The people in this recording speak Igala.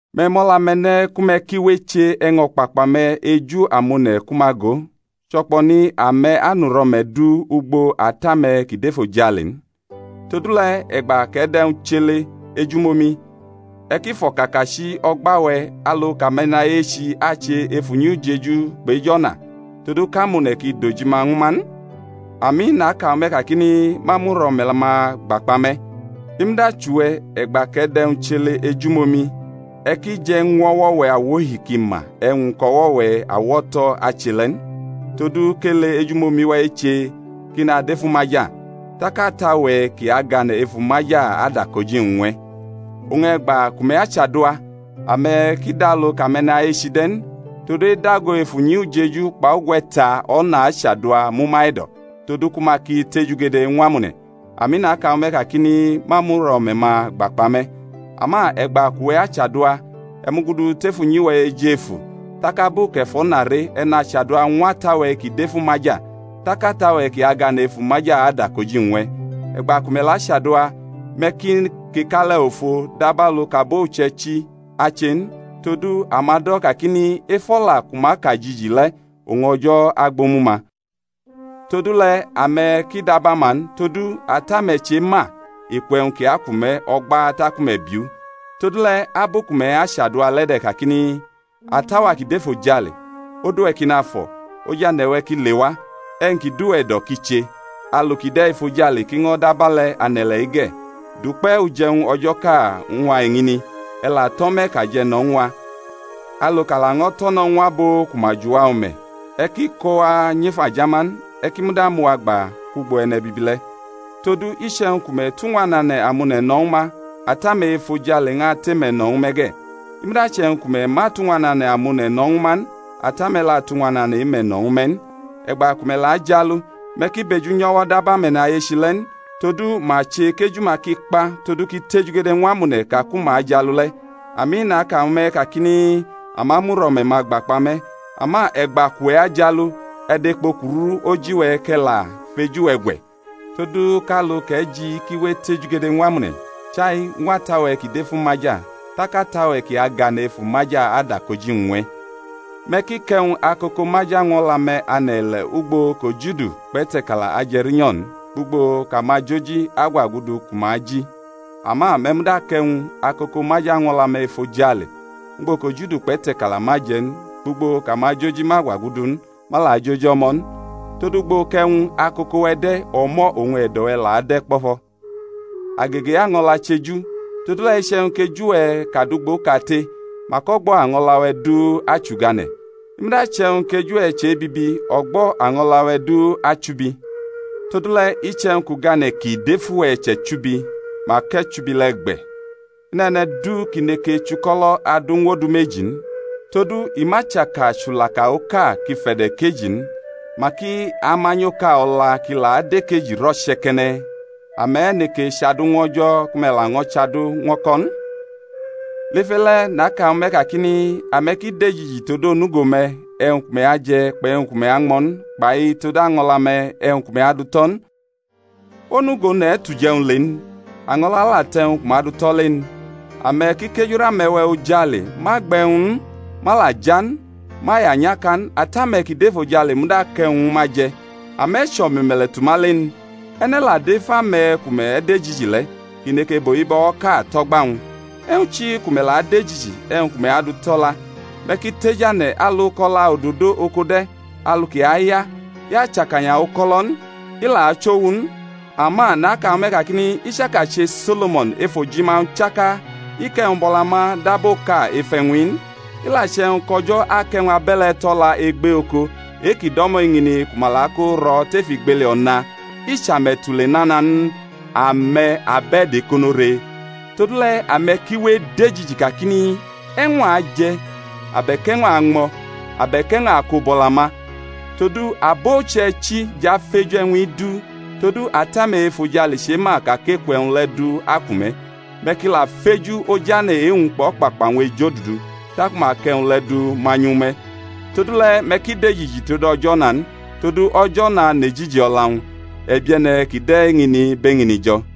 Me̩ mʼo̩la-me̩ ne̩ ku me̩ ki we eche e̩wñ o̩kpakpa-me̩ eju amone̩ ku ma go; cho̩kpo̩ni ame̩ anʼuro̩me̩ du ugbo Ata-me̩ kʼi dʼefojale n. Todule̩ e̩gba kʼe̩ dʼe̩wñ chʼele ejumomi, e̩ ki fʼo̩kakachi o̩gba-we̩, alu kʼame̩nayechi ache ef unyi ujeju kpʼej o̩na, todu kʼamone̩ ki dʼojima ñwu ma n. Ami, naka ñwu me̩ kakini, Ma mʼuro̩me̩-ma gba kpa me̩. I muda chʼuwe̩, e̩gba kʼe̩ dʼe̩wñ chʼele ejumomi, e̩ ki je̩ ñw o̩wo̩-we̩ awohi kʼi ma e̩wñ kʼo̩wo̩-we̩ awo̩to̩ ache le̩ n, todu kʼele ejumomi-we̩ eche kʼi nadʼef umaja; tak Ata-we̩ kʼi agane̩ ef umaja adʼakoji-wñ ñw e̩. Oñ e̩gba ku me̩ chadua, ame̩ ki dʼalu kʼame̩nayechi de̩ n; todu edago ef unyi ujeju kpʼugwe̩ta o̩na achadua mʼuma e̩do̩, todu ku ma ki tejugede ñw amone̩. Ami, naka ñwu me̩ kakini, Ma mʼuro̩me̩-ma gba kpa me̩. Ama e̩gba kʼuwe̩ achadua, e̩ mugudu tef unyi-we̩ ejefu, tak abu kʼe̩ fʼo̩na re, e̩ nachadua ñw Ata-we̩ kʼi dʼef umaja; tak Ata-we̩ kʼi agane̩ ef umaja adʼakoji-wñ ñw e̩. E̩gba ku me̩ la chadua, me̩ ki kekale̩ ofo dabalu kʼabo uche̩ichi ache n; todu ama do̩ kakini, Ef o̩la ku ma ka jiji le̩ oñ O̩jo̩ agbʼomu-ma. Todule̩, ame̩ ki dab ama n; todu Ata-me̩ chema eku e̩wñ kʼi aku me̩ o̩gba taku me̩ biʼu. Todule̩, abu ku me̩ achadua le de̩ kakini: Ata-wa ki dʼefojale, Odu-we̩ ki nafo̩. Ojane̩-we̩ ki lewa, E̩wñ ki dʼuwe̩ e̩do̩ ki che, Alu kʼi de̩ efojale, kʼi ño̩ dʼabe̩le̩ ane̩-ile̩-i ge̩. Dʼukpe̩ uje̩wñ o̩jo̩ʼka ñw a eñini; E̩ la tʼo̩me̩ kʼa je̩ no̩ ñw a, Alu kʼa laño̩ tʼo̩ no̩ ñw abo ku ma jʼuwa o̩me̩; E̩ ki ko wa nyʼef ajama n, E̩ ki muda mʼuwa gba kwʼugbo e̩ne̩bibi le̩. Todu iche̩wñ ku me̩ tʼuñwanane̩ amone̩ no̩ ñwu ma, Ata-me̩ e-efojale ñʼatʼe-me̩ no̩ ñwu me̩ ge̩, i muda che̩wñ ku me̩ ma tʼuñwanane̩ amone̩ no̩ ñwu ma n, Ata-me̩ la atʼuñwanane̩ e-me̩ no̩ ñwu me̩ n. E̩gba ku me̩ la ajialu, me̩ ki bʼeju nyʼo̩wo̩ dab ame̩nayechi le̩ n; todu ma che kʼeju-ma ki kpa todu kʼi tejugede ñw amone̩ ka ku ma ajialu le̩. Ami, naka ñwu me̩ kakini, Ama mʼuro̩me̩-ma gba kpa me̩. Ama e̩gba kʼuwe̩ ajialu, e̩ dʼekpo kuru oji-we̩, kʼe̩ la fʼeju-we̩ gwe̩, todu kʼalu kʼe̩ ji kʼi we etejugede ñw amone̩, chai ñw Ata-we̩ kʼi dʼef umaja; tak Ata-we̩ kʼi agane̩ ef umaja adʼakoji-wñ ñw e̩. Me̩ ki kʼe̩wñ akoko maja ñw o̩la-me̩ ane̩ ile̩ ugbo kʼojudu kpʼete̩kala aje̩ rinyo̩ n, kpʼugbo kʼamajoji agwagudu ku ma aji. Ama me̩ muda kʼe̩wñ akoko maja ñw o̩la-me̩ efojale, ugbo kʼojudu kpʼete̩kala ma aje̩ n, kpʼugbo kʼamajoji ma gwagudu n, ma la joji o̩mo̩ n. Todu, ugbo kʼe̩wñ akoko-we̩ de̩, o̩mo̩ oñ e̩do̩-we̩ la ade̩ kpo̩fo̩. Agege e-año̩la chʼeju. Todule̩, iche̩wñ kʼeju-we̩ kad ugboʼkate, mak o̩gbo̩ año̩la-we̩ du achʼugane̩; i muda che̩wñ kʼeju-we̩ che bibi, o̩gbo̩ año̩la-we̩ du achubi. Todule, iche̩wñ kʼugane̩ kʼi dʼef uwe̩ chʼe̩chubi, mak e̩chubi le̩ gbe̩! I nʼe̩ne̩ du kʼi neke chuko̩lo̩ adu ñw odu meji n; todu i ma chaka chulaka oka kʼi fe̩do̩ ekeji n, mak i amanyʼoka o̩la kʼi la adʼekeji rʼo̩che̩ke̩ne̩. Ame̩ neke chʼadu ñw O̩jo̩, ku me̩ laño̩ chʼadu ñw o̩ko̩ n. Lef e-le̩ naka ñwu me̩ kakini, Ame̩ ki dejiji tod onugo-me̩, e̩wñ ku me̩ aje̩ kpʼe̩wñ ku me̩ añmo̩ n, kpai tod año̩la-me̩, e̩wñ ku me̩ adu tʼo̩ n. Onugo one̩ tʼuje̩wñ le n? Año̩la la tʼe̩wñ ku ma du tʼo̩ le n? Ame̩ ki kejurʼame̩we̩ ojale, ma gbe̩ e̩wñ n, ma la ja n, ma ya nyʼaka n; Ata-me̩ kʼi dʼefojale muda akʼe̩wñ ñwu ma je̩. Ame̩ chʼo̩me̩me̩le̩ tʼuma le n? E̩ne̩ la dʼef ame̩ ku me̩ dejiji le̩, kʼi neke bʼohibo̩woʼka tʼo̩gba-wñ? E̩wñ chi ku me̩ la dejiji e̩wñ ku me̩ adu tʼo̩la? Me̩ ki tejane̩ alu kʼo̩la ododo oko de̩, alu kʼi aya; i achakanya uko̩lo̩ n; i la achʼowu n; ama naka ñwu me̩ kakini, I chaka che So̩lo̩mo̩n ef ojima-wñ chaka i kʼe̩wñ bʼo̩la ma dab oka ef e̩wñ-i n. I la che̩wñ kʼO̩jo̩ akʼe̩wñ abe̩le̩ tʼo̩la egbe oko, e-kʼi do̩mo̩ eñini, ku ma la kʼo ro̩ tef igbeli o̩na, i chʼe-me̩ tule nana n? Ame̩, abe̩do̩ ekono re. Todule̩, ame̩ ki we edejiji kakini, E̩wñ a aje̩? abe̩k e̩wñ a añmo̩? abe̩k e̩wñ a ako bʼo̩la ma? Todu abo uche̩ichi jʼafeju e̩wñ-i du; todu Ata-me̩ e-efojale chema ka kʼeku e̩wñ le̩ du aku me̩. Me̩ ki la feju Ojane̩ e-wñ kpʼo̩kpakpa-wñ ejodudu, taku ma akʼe̩wñ le̩ du manyʼu ñwu me̩. Todule̩ me̩ ki dejiji tod o̩jo̩ o̩na n. Todu, o̩jo̩ o̩na nʼejiji o̩la-wñ. E̩bie̩ne̩ ki de̩ eñini bʼeñini jo̩.